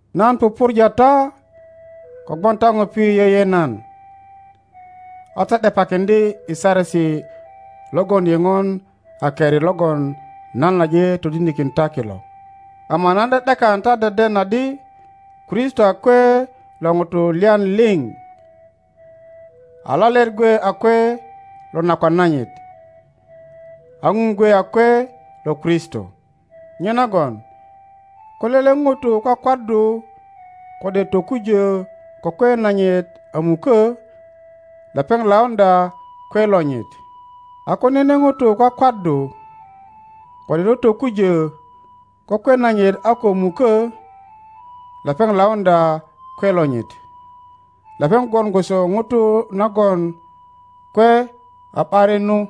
Nan pupurja ta kogwon ta ŋupi yeye nan, a ta ’depakiŋdye i saresi logon yeŋon a keri logon nan aje todinikin ta kilo. Ama nan ’de ’dekan ta deden adi Kristo a kwe lo ŋuto lyan liŋ, a lalet gwe a kwe lo nakwan nanyit, a Ŋun gwe a kwe lo Kristo. Nyenagon ko lele ŋuro kwakwaddu kode tokujö ko kwe nanyit a mukö, lepeŋ lauŋdya kwe lonyit, a ko nene ŋuro kwakwaddu kode totokujö ko kwe nanyit a ko mukö, lepeŋ lauŋdya kwe lonyit, lepeŋ gwon gwoso ŋuro nagon kwe a ’barinu.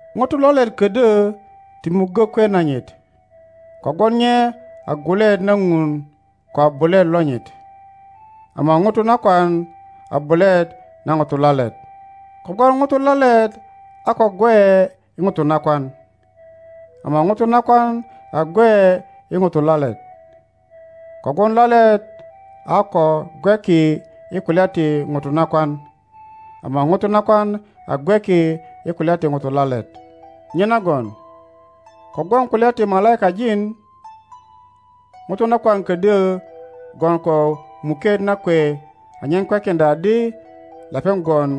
Ŋuto lalet ködyö ti muggö kwe nanyit, kogwon nye a gwuluet na Ŋun ko a bulet lonyit. Ama ŋuro nakwan a bulet na ŋuro lalet. Kogwon ŋuro lalet a ko gweye i ŋuro nakwan, ama ŋuro nakwan a gweye i ŋuro lalet. Kogwon lalet a ko gweki i kulya ti ŋuro nakwan, ama ŋuro nakwan a gweki i kulya ti ŋuro lalet. Nyenagon kogwon kulya ti malaikajin, ŋuro nakwan ködyö gwon ko muket na kwe anyen kwekiŋdya adi lepeŋ gwon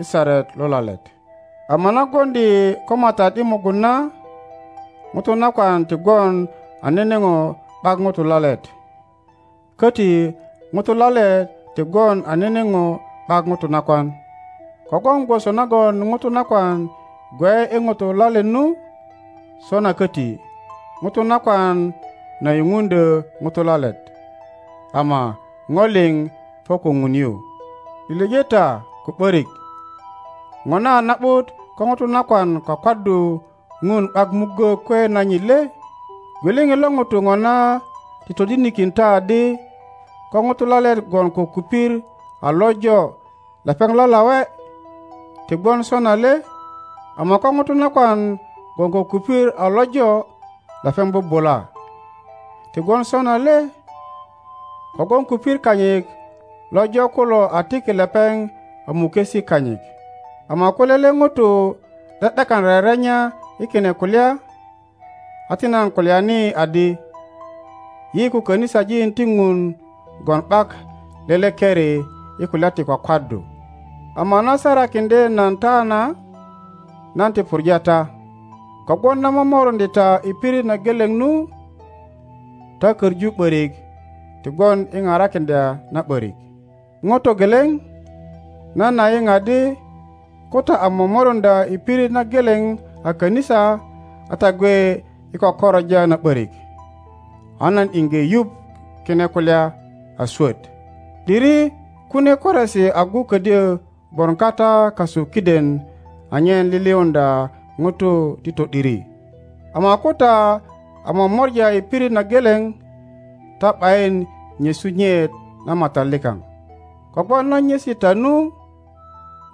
i saret lo lalet. Ama na gwoŋdi yi ko Matat i mugun na, ŋuro nakwan ti gwon a nene po ’bak ŋuro lalet, köti ŋuro lalet ti gwon a nene po ’bak ŋuro nakwan. Kogwon gwoso nagon ŋuro nakwan gweye i ŋuro lalet nu, sona köti ŋuro nakwan na yupuŋdyö ŋuro lalet, ama po liŋ po ko Ŋun yu. Lilije ta ko ’börik, ŋona a na ’but ko ŋuro nakwan kwakwaddu Ŋun ’bak muggö kwe nanyit le? Gwiliŋit lo ŋuro ŋona ti todinikin ta adi ko ŋuro lalet gwon ko kupir a lojo lepeŋ lalawe, ti gwon sona le? Ama ko ŋuro nakwan gwon ko kupir a lojo lepeŋ bubula, ti gwon sona le? Kogwon kupir kanyit lojo kulo a tiki lepeŋ a mukesi kanyit. Ama ko lele ŋuto ’de ’dekan rerenya i kine kulya, a ti nan kulyani adi, yi ko kanisajin ti ŋun gwon ’bak lele keri i kulya ti kwakwaddu. Ama na sarakiŋdye nan ta na, nan ti puŋa ta, kogwon na momoruŋdye ta i pirit na geleŋ nu, ta koŋu ’borik ti gwon i parakiŋdya na ’borik. ŋo togeleŋ, nan a yiŋ adi ko ta a momoruŋdya i, pirit na geleŋ a kanisa a ta gwe i kökoroja na ’borik; a nan iŋge yuŋ kine kulya a swot. (’Diri kunie koresi agu ködyö gwon kata kasu kiden anyen liliuŋdya ŋutu ti to ’diri.) Ama ko ta a momora i pirit na geleŋ, ta ’bayin nyesu Nyeŋ na Matat likaŋ; kogwon na nyesi ta nu,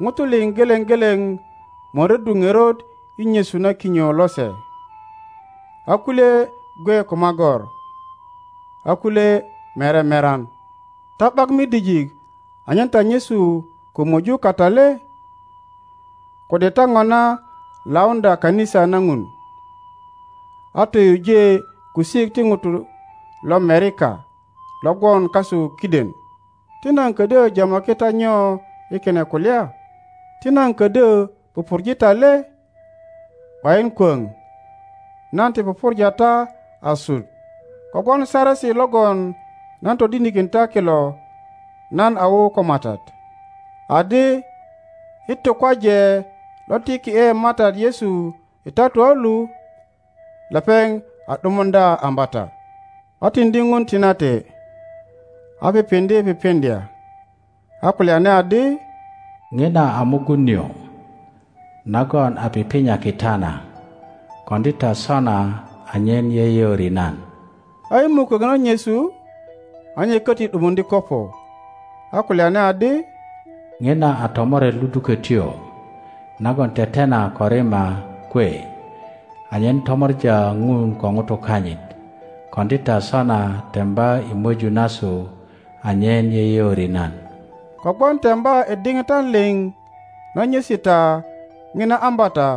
ŋutu liŋ geleŋ geleŋ möröddu ŋerot i nyesu na kinyo lose, a kulye gwe ko magor, a kulye mere meran. Ta ’bak midijik anyen ta nyesu ko möju kata le? Kode ta ŋona lauŋdya kanisa na Ŋun, a toyuje kusik ti ŋutu lomerika lo gwon kasu kiden? Ti nan ködyö jamaki ta nyo i kine kulya? Ti nan ködyö pupurje ta le? ’Bayin kwöŋ, nan ti pupurja ta asut. Kogwon saresi logon nan todinikin ta kilo nan a wu ko Matat, adi, i tukwaje lo tiki ’e Matat Yesu i tatua lu, lepeŋ a ’dumuŋdya ambata, a tiŋdi Ŋun tinate, a pipiŋdye pipiŋdya, a kulyani adi, Ŋina a mugun nio nagon a pipinyaki ta na. Koŋdi ta sona anyen yeyeori nan. A i mukök na nyesu, a nye köti ’dumuŋdye kopo, a kulyani adi, Ŋina a tomoret ludukötyo nagon tetena ko rima kwe anyen tomor a Ŋun ko ŋutu kanyit. Koŋdi ta sona temba i möju nasu anyen yeyeori nan. Kogwon temba i diŋitan liŋ na nyesi ta ŋina ambata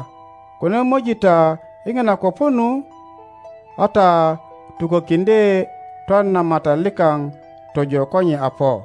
ko na möji ta i ŋina kopo nu, a ta tukökiŋdye twan na Matat likaŋ tojo ko nye a po.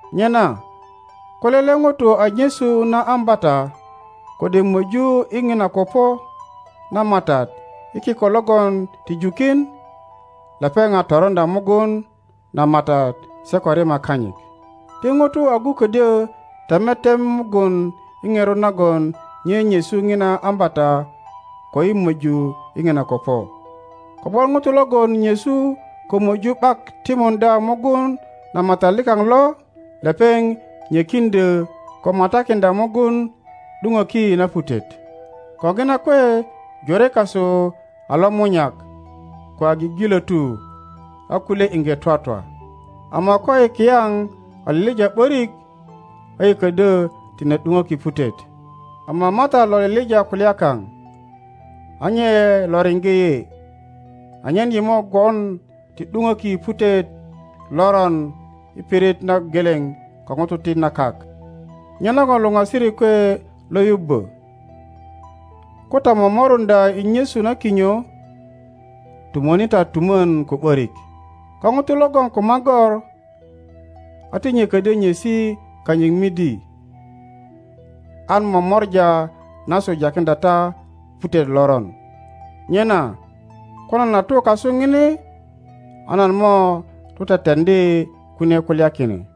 Nyena ko lele ŋuto a nyesu na ambata kode möju i ŋina kopo na Matat i kiko logon ti jukin, lepeŋ a toroŋdya mugun na Matat se ko rima kanyit. Ti ŋuto agu ködyö teme tem mugun i ŋerot nagon nye nyesu ŋina ambata koi möju i ŋina kopo. Kogwon ŋuto logon nyesu ko möju ’bak timuŋdya mugun na Matat likaŋ lo, lepeŋ nyökiŋdyö ko matakiŋdya mugun ’duŋöki na putet. Ko ŋina kwe jore kasu a lomunyak ko a gigilötu, a kulye iŋge twatwa. Ama koyi kiyaŋ a lilija ’börik, a yi ködyö tine ’duŋöki putet; ama Matat lo lilija kulya kaŋ, a nye lo riŋge yi, anyen yi mo gwon ti ’duŋöki putet loron i pirit na geleŋ ko ŋutu ti na kak. Nyenagon luŋasirik kwe lo yubbö, ko ta momoruŋdya i nyesu na kinyo, tumöni ta tumön ko ’börik. Ko ŋuto logon ko magor, a ti nye ködyö nyesi kanyit midi, an momora nasu jakiŋdya ta putet loron. Nyena ko nan a tu kasu ŋini a nan mo tu teteŋdi kunie kulya kine.